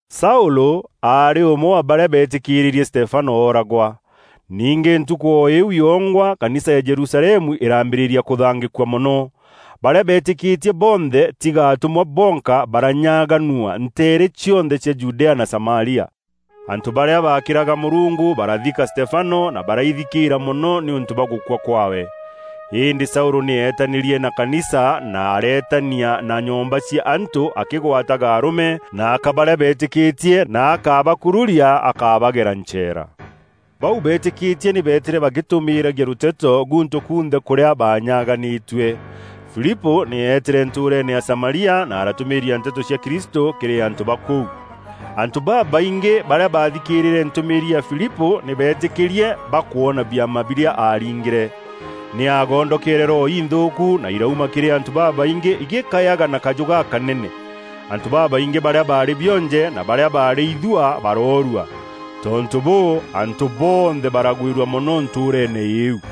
Saûlû aarî ûmwe wa barîa beetîkîrîrie Stefano ooragwa. Ningî ntukû o îu yongwa Kanisa ya Jerusalemu îraambîrîria kûthangîkua mono. Barîa beetîkîtie bonthe, tiga atûmwa bonka, baranyaganua nteere cionthe cia Judea na Samaria. Antû barîa baakîraga Mûrungu barathika Stefano na baraithikîîra mono nîûntû bwa gûkua kwaawe. Îndî Saûlû nî eetanîrie na kanisa na areetania na nyomba cia antû akîgwataga arûme na aka barîa beetîkîtie na akabakururia akabagera ncheera. Bau beetîkîtie nî beetîre bagîtûmîîragia rûteto gûntû kunthe kûrîa baanyaganîtue. Filipû nî eetîre ntûûreene ya Samaria na aratûmîîria nteto cia Kristû kîrî antû ba kûu. Antû babaingî barîa baathikîrîre ntûmîîri ya Filipû nî beetîkîrie bakwona biama birîa aaringîre. Nî aagondokeere roho inthûûku na irauma kîrî antû babaingî igîkayaga na kajû gakanene. Antû babaingî barîa baarî bionje, na barîa baarî ithuaa baroorua. Tontû bûû, antû bonthe baragwîrua mono ntûûreene îîu.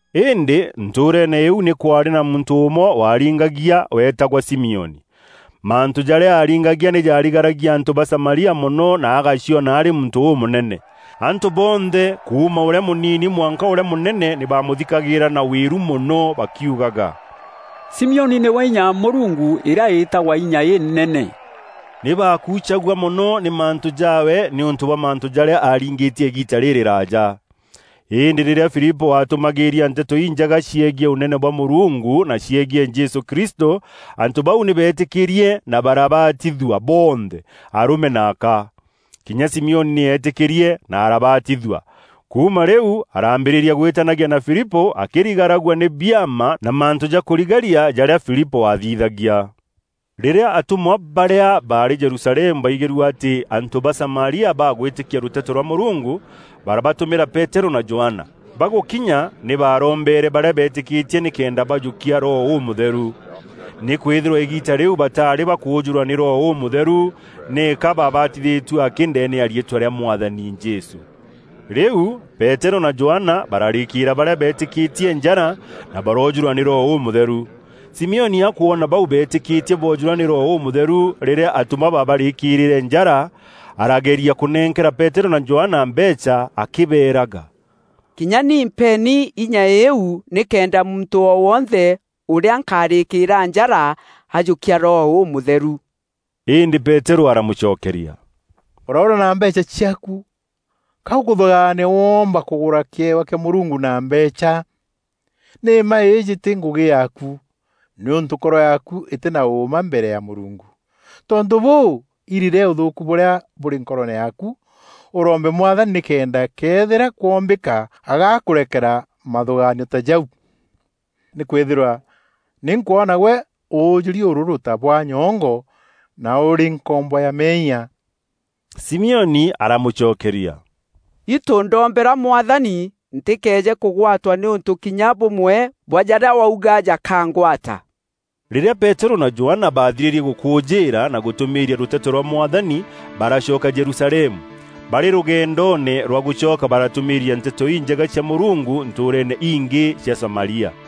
Îndî ntûûreene îîu nî kwaarî na muntû ûmwe waaringagia, weetagwa Simioni. Mantû jarîa aaringagia nî jaarigaragia antû ba Samaria mono na agaciona arî muntû ûmûnene. Antû bonthe, kuuma ûrîa mûnini mwanka ûrîa mûnene nî baamûthikagîîra na wîru mono bakiugaga, “Simioni nîwe inya ya Mûrungu îrîa îtagwa ‘Inya Inene.’” Nî baakuucagua mono nî mantû jaawe nîûntû bwa mantû jarîa aaringîtie îgiita rîrîraaja. Îndî rîrîa Filipû aatûmagîîria Nteto Injega ciegiî Ûnene bwa Mûrungu na ciegiî Jesû Kristû antû bau nî beetîkîrie na barabatithua bonthe, arûme na aka. Kinya Simioni nî eetîkîrie na arabatithua. Kuuma rîu araambîrîria gwîtanagia na Filipû akîrigaragua nî biama na mantû ja kûrigaria jarîa Filipû aathithagia. Rîrîa atûmwa barîa baarî Jerusalemu baigîrue atî antû ba Samaria baagwîtîkia rûteto rwa Mûrungu, barabatûmîra Peterû na Johana. Bagûkinya nî baarombeere barîa beetîkîtie nîkenda bajûkia Roho Ûmûtheru, nîkwîthîrwa îgiita rîu bataarî bakûûjûrwa nî Roho Ûmûtheru, nîka baabatithîtue akî ndeene ya riîtwa rîa Mwathani Jesû. Rîu Peterû na Johana bararîkîîra barîa beetîkîtie njara, na baroojûrwa nî Roho Ûmûtheru. Simioni akwona bau beetîkîtie boojûrwa nî Roho Ûmûtheru rîrîa atûmwa baabarîîkîrîre njara, arageria kûnenkera Peterû na Johana mbeecha akîbeeraga, “Kinya nî mpeeni inya îîu nîkenda muntû o wonthe ûrîa nkarîkîîra njara, ajûkia Roho Ûmûtheru.” Îndî Peterû aramûcokeria, “Ûroûra na mbeecha ciaaku! Ka ûkûthûgaania woomba kûgûra kîewa kîa Mûrungu na mbeecha? Nî mma îîjî tî ngûgî yaaku, nîûntû nkoro yaaku îtî na ûûma mbere ya Mûrungu. Tontû bûû, irire ûthûûku bûrîa bûrî nkoroone yaaku, ûrombe Mwathani nîkenda këethîra kwoombîka agakûrekera mathûgaanio ta jau. Nîkwîthîrwa nî nkwona gwe ûûjûri ûrûrû ta bwa nyongo na ûrî nkombo ya meeyia!” Simioni aramûcokeria, “Itû ndoombera Mwathani ntîkeeje kûgwatwa nî ûntû kinya bûmwe bwa jarîa wauga jakangwata.” Rîrîa Peterû na Johana baathirîrie gûkûûjîîra na gûtûmîîria rûteto rwa Mwathani, baracoka Jerusalemu. Barî rûgendoone rwa gûcoka baratûmîîria Nteto Injega cia Mûrungu ntûûreene ingî cia Samaria.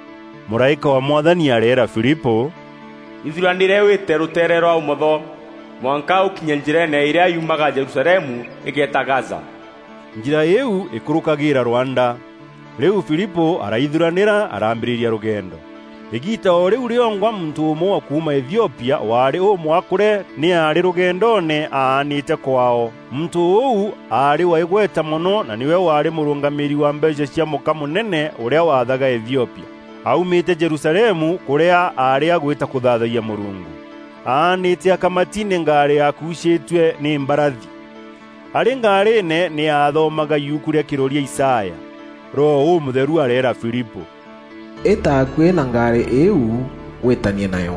Mûraîka wa Mwathani areera Filipû, “Ithuranîre wîte rûteere rwa ûmotho, mwanka ûkinye njîreene îrîa yuumaga Jerusalemu îgeeta Gaza.” Njîra îîu îkûrûkagîîra rwanda. Rîu Filipû araithuranîra, araambîrîria rûgendo. Îgiita o rîu rîongwa muntû ûmwe wa kuuma Ethiopia, waarî ûmwakûre nî aarî rûgendoone aanîte kwaao. Muntû ûu aarî wa îgweta mono na nîwe waarî mûrûngamîîri wa mbeecha cia mûka-mûnene ûrîa waathaga Ethiopia. Aaumîte Jerusalemu kûrîa aarî agwîta kûthaathayia Mûrungu. Aanîte akamati nî ngaarî yaakuucîîtue nî mbarathi. Arî ngaarîîne, nî aathomaga yuku rîa kîroria Isaya. Roho Ûmûtheru areera Filipû, “Îta akuî na ngaarî îîu, wîîtanie nayo.”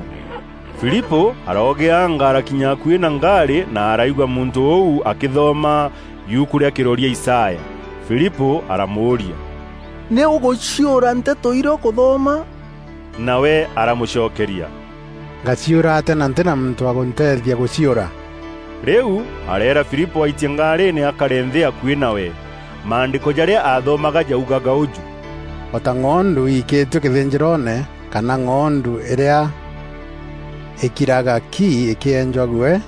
Filipû aroogîanga arakinya akuî na ngaarî na araigua muntû ûu akîthoma yuku rîa Kîroria Isaya. Filipû aramûûria, “Nî ûgûciûra nteto irîa ûkûthoma?” Nawe aramûcokeria, “Ngaciûra atîa na ntî na muntû wa gûnteethia gûciûra?” Rîu areera Filipû aitie ngaarîîne akare nthî akuî nawe. Maandîko jarîa aathomaga jaugaga ûjû: “O ta ng'ondu iikîtue kîthînjîroone kana ng'ondu îrîa îkiraga ki îkîenjwa guee,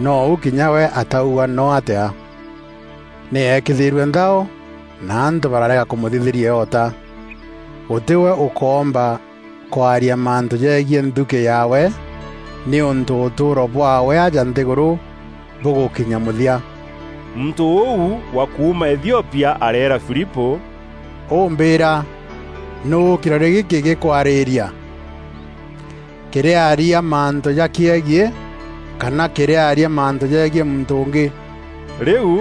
nou kinya we atauga noo atîa. Nî eekîrithîrue nthao na antû barareega kûmûthithîria îota. Gûtî we ûkoomba kwaria mantû jegiî nthukî yaawe nîûntû ûtûûro bwaawe aja nthîgûrû bûgûkinya mûthia.” Muntû ûu wa kuuma Ethiopia areera Filipû, “Û mbîîra, nûû kîroria gîkî gîkwarîîria? Kîrîaria mantû jakîegiî kana kîrîaria mantû jegiî muntû ûngî?” Rîu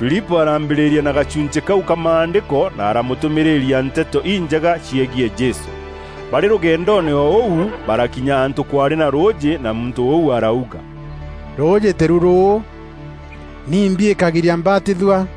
Filipû araambîrîria na gachunchî kau ka Maandîko na aramûtûmîrîria Nteto Injega ciegiî Jesû. Barî rûgendoone o ûu, barakinya antû kwaarî na rûûjî na muntû ûu arauga, “Rûûjî tîru rûû! Nîmbi îkagiria mbatithua?” [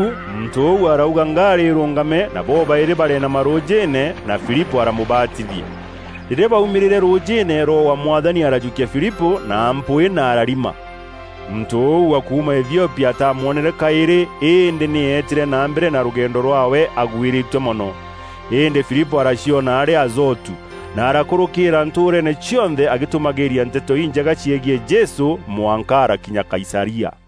Rîu muntû ûu arauga ngaarî îrûngame na bobaîrî bareenama rûûjîîne, na Filipû aramûbatithia. Rîrîa baumîrîre rûûjîîne, Roho wa Mwathani arajûkia Filipû na mpwîî na ararima. Muntû ûu wa kuuma Ethiopia ataamwonere kaîrî îndî nî eetîre na mbere na rûgendo rwaawe agwîrîtue mono. Îndî Filipû araciona arî Azotu na arakûrûkîîra ntûûreene cionthe agîtûmagîîria Nteto Înjega ciegiî Jesû mwanka arakinya Kaisaria.